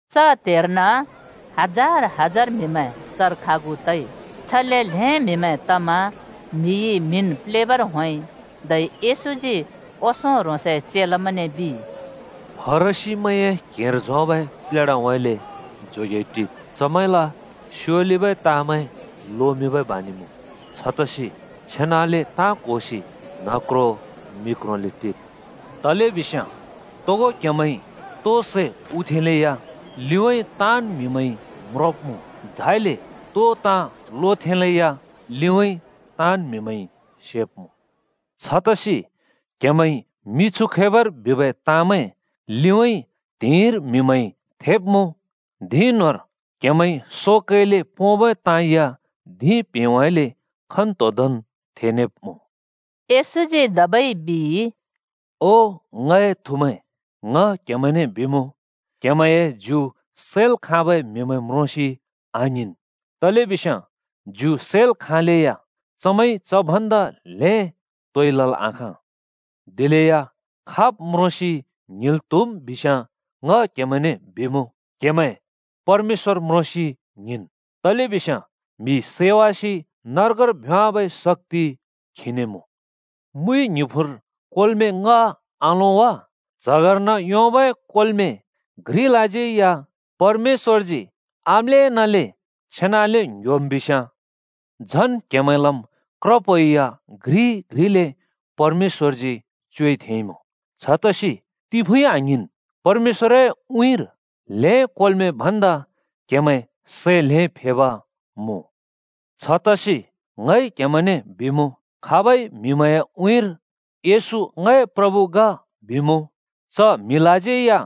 च त्हेर्न हजार हजार म्‍हिमैं चर खागु तइ। छले ल्हें म्‍हिमैं तमा म्हिइ म्‍हिन् प्लेबर होंइ। धै येशूजी ओंसों ह्रोंसए चेलामैंने बिइ, “फरिसीमैंए क्हेंर झोंबै प्लेढाउँइँले जोगेइ टिद्। चमैंल स्‍योलिबै ताँमैं लोमिंबै बानि मुँ। छतसि छेनाले ताँ क्होसि न्ह क्रों मि क्रोंले टिद्। तलेबिस्याँ तोगो क्‍हेमैंइ तो सै हुथेंलेया लिउँइँ ताँन् म्हिमैंइ म्रोंब्‍मुँ। झाइले तो ताँ लोथेंबै लिउँइँ ताँन् म्हिमैंइ सेब्‍मुँ। छतसि क्‍हेमैंइ मिछु खैबर बिबै ताँमैं लिउँइँ त्‍हिंइर म्हिमैंइ थेब्‍मुँ। धिं न्‍होंर क्‍हेमैंइ सो कैले पोंबै ताँ या धिं प्हेंउँइँले खन्‍तोंदोंन् थेनेब्‍मुँ।” येशूजी धबै बिइ, “ओ ङए थुमैं! ङ क्‍हेमैंने बिमुँ, क्‍हेमैंए ज्यु सैल् खाँबै म्‍हिमैं म्रोंसि आङ्हिंन्। तलेबिस्याँ ज्यु सैल् खाँलेया चमैंइ च भन्दा ल्हें तोइ लल् आखाँ। दिलेया खाब् म्रोंसि ङ्हिंल् त्‍हुम् बिस्याँ ङ क्‍हेमैंने बिमुँ, क्‍हेमैं परमेश्‍वर म्रोंसि ङ्हिंनु, तलेबिस्याँ म्हि सैवासि नर्गर भ्‍योंवाबै शक्‍ति खीने मुँ। “मुइ ङ्हिफुँर कोर्में ङ्‌ह आलों वा? च्हगर्न योंबै कोर्में घ्रिलाज्यै या परमेश्‍वरजी आम्‍लेनले छेनाले ङ्‌ह्‍योम् बिस्याँ झन् क्हेमैंलम् क्रप्हो या घ्रि घ्रिले परमेश्‍वरजी च्योइ थेंइमुँ। छतसि तिफुँइ आङ्हिंन्, परमेश्‍वरए उँइँर ल्‍हें कोर्में भन्दा क्‍हेमैं सै ल्हें फेब मुँ। “छतसि ङइ क्‍हेमैंने बिमुँ, खाबइ म्‍हिमैंए उँइँर ‘येशू ङए प्रभु ग’ बिमुँ, च म्हिलाज्यै या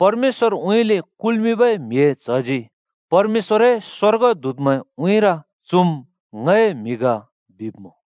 परमेश्‍वरउँइँले कुल्‍मिंबै म्हिए च्हजी परमेश्‍वरए स्‍वर्गदूतमैं उँइँर ‘चुम् ङए म्‍हि ग’ बिब्‍मुँ।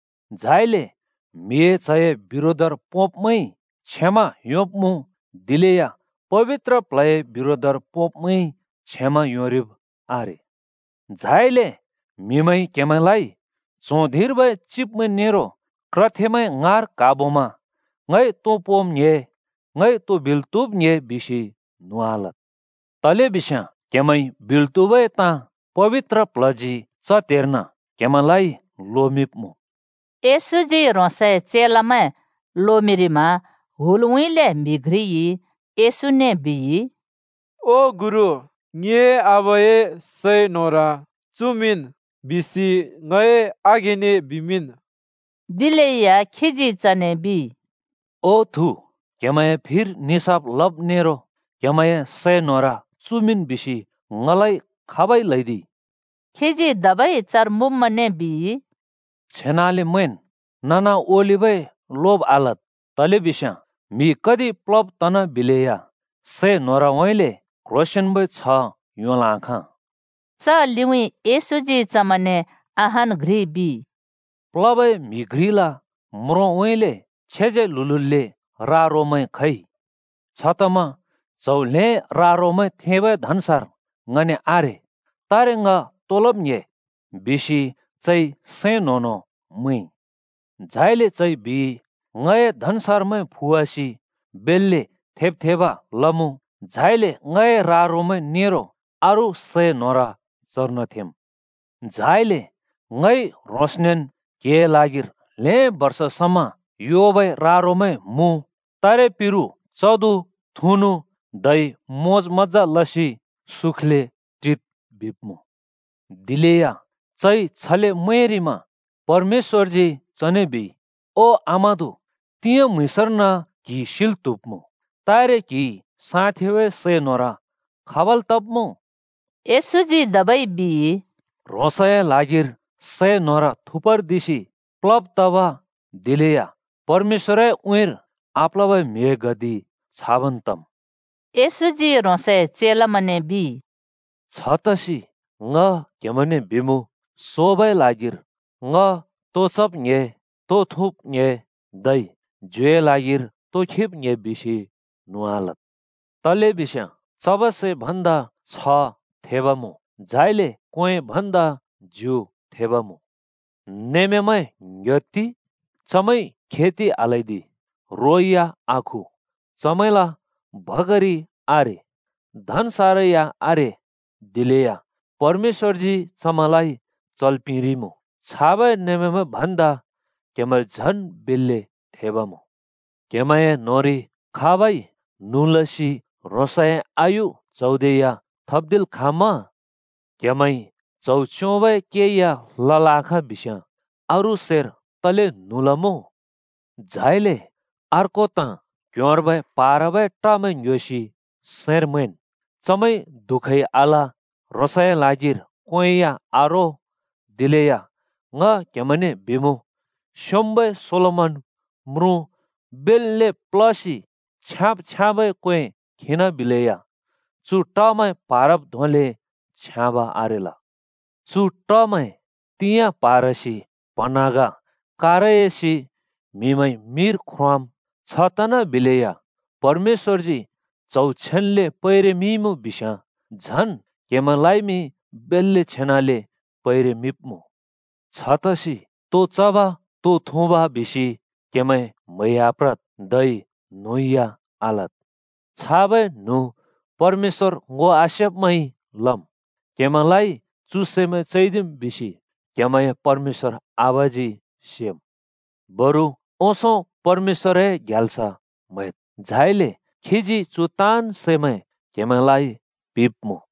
“झाइले म्हिए च्हए बिरोधर पोंब्मैंइ क्षमा योंब्मुँ। दिलेया पबित्र प्ल्हए बिरोधर पोब्मैंइ क्षमा योंरिब आरे। “झाइले म्हिमैंइ क्‍हेमैंलाइ च्हों धिंर्बै चिब्मैं नेरो क्रथेमैं ङाँर क्हाबोमा ‘ङइ तो पोंब् ङ्‍हे? ङइ तो बिल् त्‍हुब् ङ्‍हे?’ बिसि न्हुँ आलद्। तलेबिस्याँ क्‍हेमैंइ बिल् त्‍हुबै ताँ पबित्र प्ल्हजी च त्‍हेर्न क्‍हेमैंलाइ लोमिंब्‍मुँ।” येशूजी ह्रोंसए चेलामैं लोमिंरिमा हुलउँइँले म्‍हि घ्रिइ येशूने बिइ, “ओ गुरु, ङिए आबाए सै न्होर अँश लमिंन् बिसि ङए आघेंने बिमिंन् ओ।” दिलेया खीजी चने बिइ, “ओ थु, क्‍हेमैंए फिर निसाफ लब् नेरो क्हेमैंए सै न्होर चुमिंन् बिसि ङलाइ खाबइ ल्हैदिइ?” खीजी धबै चर मुँब्मैंने बिइ, “छेनाले मैंन्, नना ओलिबै लोब् आलद्, तलेबिस्याँ म्‍हि कति प्‍ल्हो‍ब तनाबिलेया सै न्होरउँइँले क्‍ह्रोंसेंन्‍बै छ्ह योंल् आखाँ।” च लिउँइँ येशूजी चमैंने अहान् घ्रि बिइ, “प्‍ल्होबै म्‍हि घ्रिल म्रोंउँइँले छेज्याल्हुल्हुले रा-रोमैं खइ। छतमा ‘च्‍हौ ल्‍हें रा-रोमैं थेंबै धन्‍सार ङने आरे! तारे ङ तो लब् ङ्‍हे?’ बिसि चइ सैं न्‍हों न्‍हों मैंइ। झाइले चइ बिइ, ‘ङए धन्‍सारमैं फुवासि बेल्‍ले थेब् थेब लमुँ। झाइले ङए रा-रोमैं नेरो अरू सै न्होर चर्न थेंम्। झाइले ङइ ह्रोंसनेन् क्हिए ल्हागिर ल्‍हें बर्ष समा योबै रा-रोमैं मुँ। तारे पिरु चदु, थुँनु, धै मोज-मज्‍जा लसि सुखले टिद्,’ बिब्मुँ। दिलेया चइ छले मैंरिमा परमेश्‍वरजी चने बिइ, ‘ओ आमादु! तिंयाँ म्‍हुँइँसर्न क्‍हि सिल् त्‍हुब्मुँ। तारे क्‍हिइ साँथेंबै सै न्होर खाबल् तब्मुँ?’” येशूजी धबै बिइ, “ह्रोंसए ल्हागिर सै न्होर थुपर्दिसि प्लब तब दिलेया परमेश्‍वरए उँइँर आप्‍ल्होबै म्‍हिए गति छाबन् तम्।” येशूजी ह्रोंसए चेलामैंने बिइ, “छतसि ङ क्‍हेमैंने बिमुँ, सोबै ल्हागिर ‘ङ तो चब् ङ्‍हे? तो थुँब् ङ्‍हे? धै ज्युए ल्हागिर तो खिब् ङ्‍हे?’ बिसि न्हुँ आलद्। तलेबिस्याँ चबै सै भन्दा जीबन थेब मुँ, झाइले क्‍वें भन्दा ज्यु थेब मुँ। “कगामैं ङ्‌ह्‍योत्ति! चमैंइ खेति आल्‍हैदि, रो या आखु, चमैंल भकारि आरे, धनसारमैं या आरे। दिलेया परमेश्‍वरजी चमैंलाइ चल् पिंरिइमुँ। छाबै नमेंमैं भन्दा क्‍हेमैं झन् बेल्‍ले थेब मुँ। क्‍हेमैंए न्होंरि खाबइ न्हुँ लसि ह्रोंसए आयु च्‍हौदे या थप्दिल् खाँम्‍मा? क्‍हेमैंइ च्‍हौ च्‍योंबै के या लल् आखाँ बिस्‍याँ अरू सैर तले न्हुँ लमुँ? “झाइले अर्को ताँ: क्ह्‍योंर्बै प्हारबै टमैं ङ्‌ह्‍योसि सैंर मैंन्। चमैंइ दुःखै आल, ह्रोंसए ल्हागिर क्‍वें या आरो। दिलेया ङ क्‍हेमैंने बिमुँ, स्‍योंम्‍बै सोलोमन म्रुँ बेल्‍ले प्‍ल्‍होसि छ्याँब् छ्याँबै क्‍वें खिनाबिलेया चु टमैं प्‍हारब् धोंले छ्याँब आरेल। चु टमैं तिंयाँ प्‍हारसि प्‍हँन्हाँग कारयासि म्हिमैंइ मिर ख्रोंवाम्। छ तनाबिलेया परमेश्‍वरजी च्‍हौ छेन्‍ले पैरेमिंइमुँ बिस्याँ झन् क्‍हेमैंलाइमि बेल्‍ले छेनाले पैरेमिंब्मुँ। “छतसि तो चब, तो थुँब बिसि क्हेमैं म्हैइ आप्रद्, धै न्हुँ या आलद्। छाबै न्हुँ परमेश्‍वर ङो आसेब्‍मैंइ लम्। क्‍हेमैंलाइ चु सैमैं चैदिम् बिसि क्हेमैंए परमेश्‍वर आबाजी सेम्। बरु ओंसों परमेश्‍वरए ग्याल्स म्‍हैद्‌। झाइले खीजी चु ताँन् सैमैं क्‍हेमैंलाइ पिंब्‍मुँ।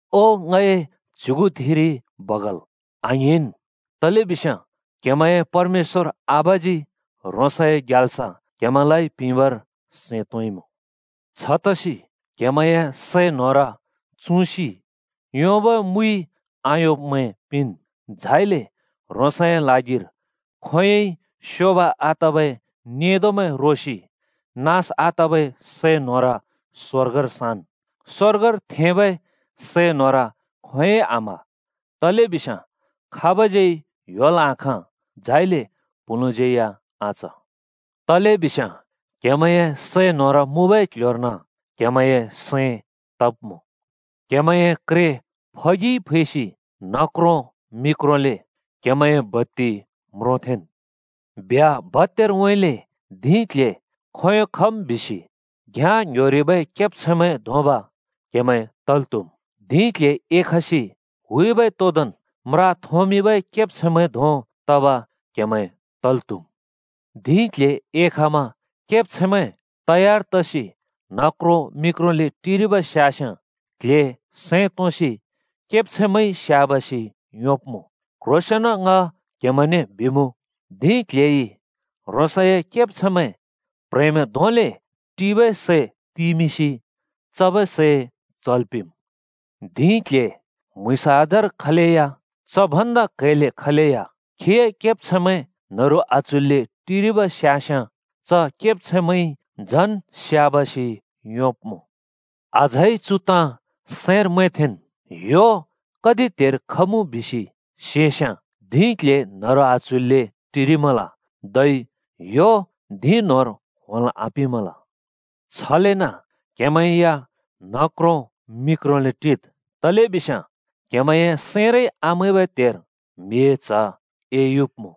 ओ ङए च्‍युगुथिरि बगाल, आङ्हिंन्। तलेबिस्याँ क्हेमैंए परमेश्‍वर आबाजी ह्रोंसए ग्याल्स क्हेमैंलाइ पिंबर सैं तोंइमुँ। “छतसि क्हेमैंए सै न्होर चुँसि योंबै मुइ आयोंब्मैं पिंन्। झाइले ह्रोंसए ल्हागिर खोंयोंइ स्योब आतबै नेंदोमैं रोसि नाँस आतबै सै न्होर स्‍वर्गर साँन्। स्‍वर्गर थेंबै सै न्होर खोंयोंइ आम्ह, तलेबिस्याँ खाबज्यै ह्‍योल् आँखाँ, झाइले प्‍हुँलुँज्‍यै आच। तलेबिस्याँ क्‍हेमैंए सै न्होर मुँबै क्ल्ह्‍योर्न क्‍हेमैंए सैं तब्‍मुँ। “क्हेमैंए क्रे फगि खिसि न्ह क्रों मि क्रोंले क्हेमैंए बत्ति म्रोथेंन्। ब्ह्‍या भत्‍यारउँइँले धिं क्‍ल्‍हे खोंयों खम् बिसि घ्याँ ङ्‍ह्‍योरिबै केब्छैंमैं धोंब क्हेमैं तल् त्हुम्। धिं क्‍ल्‍हे एखसि हुइबै तोदोंन् म्रा थोंमिंबै केब्छैंमैं धों तब क्हेमैं तल् त्‍हुम्। धिं क्‍ल्‍हे एखमा केब्छैंमैं तयार तसि न्ह क्रों मि क्रोंले टिरिब स्यास्‍याँ क्ल्हे सैं तोंसि केब्छैंमैंइ स्‍याबासि योंब्‍मुँ। क्ह्रोंसेंन ङ क्‍हेमैंने बिमुँ, धिं क्‍ल्‍हेइ ह्रोंसए केब्छैंमैं प्‍ह्रेंमैं धोंले टिबै सै तिमिंसि चबै सैं चल् पिंम्। धिं क्‍ल्‍हे म्‍हुँइँस आधार खलेया च भन्दा क्हैल्‍ले खलेया खीए केब्छैंमैं न्हरु आच्हुइल्‍ले टिरिब स्यास्‍याँ च केब्छैंमैंइ झन् स्‍याबासि योंब्‍मुँ। “अझै चु ताँ सैंर मैंथेंन्, ह्‍यो कति त्‍हेर खमुँ बिसि सेस्‍याँ धिं क्‍ल्‍हे न्हरु आच्हुइल्‍ले टिरिमल, धै ह्‍यो धिं न्होंर होंल् आपिंमल। छलेन क्‍हेमैं या न्ह क्रों मि क्रोंले टिद्, तलेबिस्याँ क्‍हेमैंए सैंरै आमैंबै त्‍हेर म्हिए च्ह एयुब्‍मुँ।”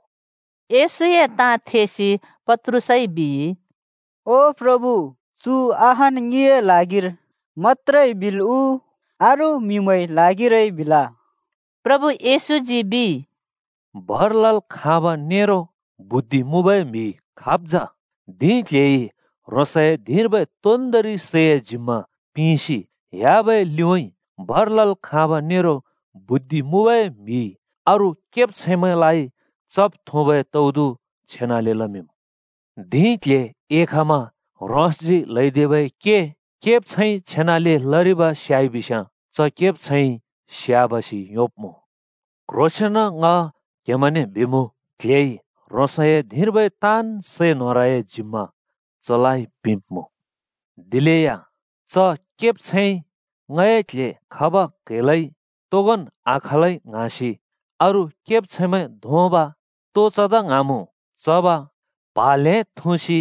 येशूए ताँ थेसि पत्रुसइ बिइ, “ओ प्रभु, चु अहान् ङिए ल्हागिर मत्‍त्रे बिल् उ, अरू म्हिमैंए ल्हागिरै बिल?” प्रभु येशूजी बिइ, “भर लल् खाँब नेरो बुद्धि मुँबै म्हि खाब् जा? धिं क्‍ल्‍हेइ ह्रोंसए धिंर्बै तोन्दोंरि सैए जिम्‍मा पिंसि ह्‍याबै लिउँइँ भर लल् खाँब नेरो बुद्धि मुँबै म्हिइ अरू केब्छैंमैंलाइ चब् थुँबै तौदु छेनाले लमिंम्। धिं क्‍ल्‍हे एखमा ह्रोंसजी ल्‍हैदिबै के केब्छैंइ छेनाले लरिब स्‍याइबिस्‍याँ च केब्छैंइ स्याबासि योंब्‍मुँ! क्ह्रोंसेंन ङ क्हेमैंने बिमुँ, क्ल्हेइ ह्रोंसए धिंर्बै ताँन् सै न्होरए जिम्मा चलाइ पिंब्मुँ। दिलेया च केब्छैंइ ‘ङए क्‍ल्‍हे खब क्‍हैलै तोगोन् आखालै,’ ङ्हाँसि अरू केब्छैंमैं धोंब, तो चदा ङ्हाँमुँ चब, प्हा ल्‍हें थुँसि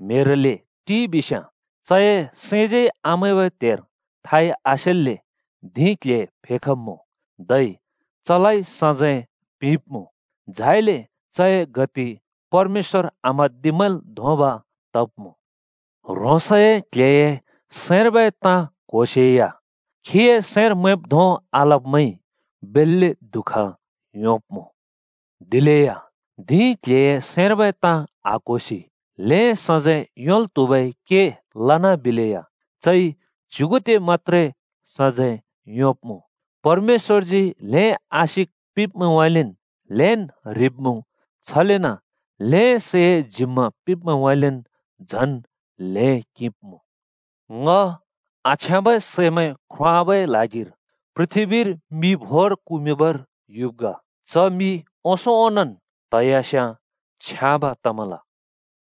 न्‍हेल्‍ले टिइ बिस्‍याँ, चए सैंज्यै आमैंबै त्हेर थाइ आसेल्‍ले धिं क्‍ल्‍हे फेखब्‍मुँ, धै चलाइ सजैं पिंब्‍मुँ। झाइले चए गति परमेश्‍वर आम्हाँदिब्‍मैंल् धोंब तब्‍मुँ। “ह्रोंसए क्ल्हेए सैंर्बै ताँ क्होसेया खीए सैंर मैंब् धों आलब्मैंइ बेल्‍ले दुःख योंब्मुँ। दिलेया धिं क्ल्हेए सैंर्बै ताँ आक्होसि ल्हें सजैं योंल् त्हुबै के लनाबिलेया चइ च्युगुदे मत्‍त्रे सजैं योंब्मुँ। परमेश्‍वरजी ल्‍हें आशिक पिंब्मैंउँइँले ल्हेंन् ह्रिब्मुँ, छलेन ल्‍हें सैए जिम्‍मा पिंब्मैंउँइँले झन ल्‍हें किंब्मुँ। “ङ आछ्याँबै सैमैं ख्रोंवाबै ल्हागिर पृथ्‍बीर मि भोर कुमिंबर युब् ग। च मि ओंसों ओंनोंन् त्हयास्‍याँ छ्याँब तमल।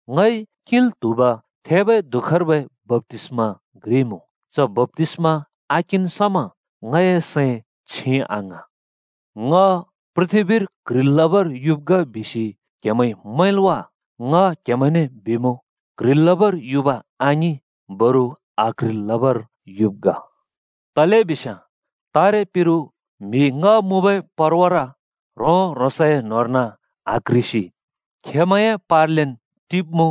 ङइ किंल् त्हुब थेबै दुःखर्बै बप्‍तिस्मा घ्रि मुँ, च बप्‍तिस्मा आकिंन् समा ङए सैं छिं आङ्हाँ। “ङ पृथ्‍बीर क्ह्रिल् लबर युब् ग बिसि क्‍हेमैंइ मैंल् वा? ङ क्‍हेमैंने बिमुँ, क्ह्रिल् लबर युब आङिं, बरु आक्‍ह्रिल् लबर युब् ग। तलेबिस्याँ तारे पिरु म्हि ङ्‍ह मुँबै परवार ह्रों-ह्रोंसए न्होंर्न आक्ह्रिसि खेंमैंए पार्लेन् टिब्मुँ।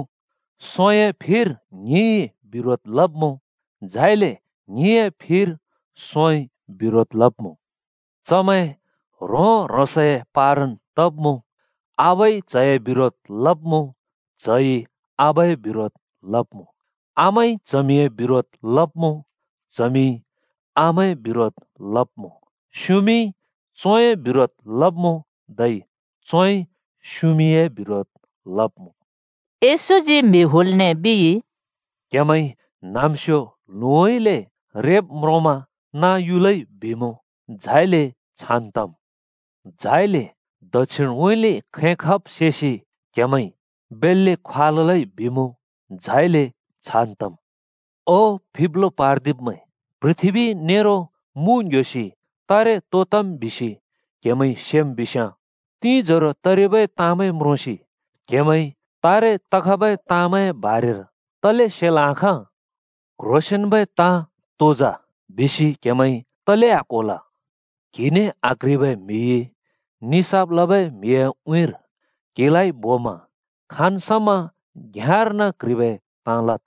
सोंए फिर ङ्हिंइ बिरोध लब्मुँ, झाइले ङ्हिंए फिर सोंइ बिरोध लब्‍मुँ। चमैं ह्रों-ह्रोंसए पारन् तब्‍‍मुँ। आबाइ च्‍हए बिरोध लब्‍मुँ, च्‍हइ आबाए बिरोध लब्मुँ। आमाइ चमिए बिरोध लब्‍मुँ, चमिइ आमाए बिरोध लब्मुँ। स्‍युमिइ चोंए बिरोध लब्‍मुँ धै चोंइ स्‍युमिए बिरोध लब्मुँ।” येशूजी म्हि हुलने बिइ, “क्‍हेमैंइ न्‍हाँम्‍स्यो ल्हुउँइँले (पश्‍चिमउँइँले) रेब् म्रोंमा ‘नाँ युलै’ बिमुँ। झाइले छान तम्। झाइले दक्षिणउँइँले खैं खब् सेसि क्‍हेमैंइ ‘बेल्‍ले ख्वाललै बिमुँ।’ झाइले छान् तम्। ओ फिब्लो पार्दिब्‍मैं! पृथ्‍बी नेरो मुँ ङ्‌ह्‍योसि तारे तो तम् बिसि क्‍हेमैंइ सेम् बिस्याँ, तिंजरो तरिबै ताँमैं म्रोंसि क्‍हेमैंइ तारे तखबै ताँमैंए बारेर तले सेल् आखाँ? “क्ह्रोंसेंन्बै ताँ तो जा? बिसि क्हेमैंइ तले आक्होल? क्‍हिने आक्ह्रिबै म्‍हिइ निसाफ लबै म्हिए उँइँर क्हिलाइ बोमा खाँन् समा घ्‍याँर्न क्‍ह्रिबै ताँ लद्,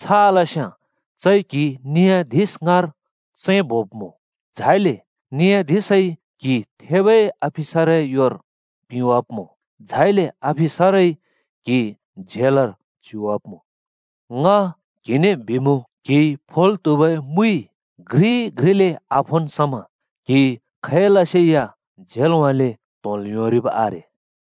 छ आलस्‍याँ चइ क्‍हि नि‍याधिश ङाँर चैंबोब्‍मुँ। झाइले नि‍याधिशइ क्‍हि थेबै अफिसरए योर पिंवाब्मुँ। झाइले अफिसरइ क्‍हि झेलर च्युवाब्‍मुँ। ङ क्‍हिने बिमुँ, क्‍हिइ फोल् त्‍हुबै मुइ घ्रि-घ्रिले आफोन् समा क्हि खैलसे या झेलउँइँले त्‍होंल् योंरिब् आरे।”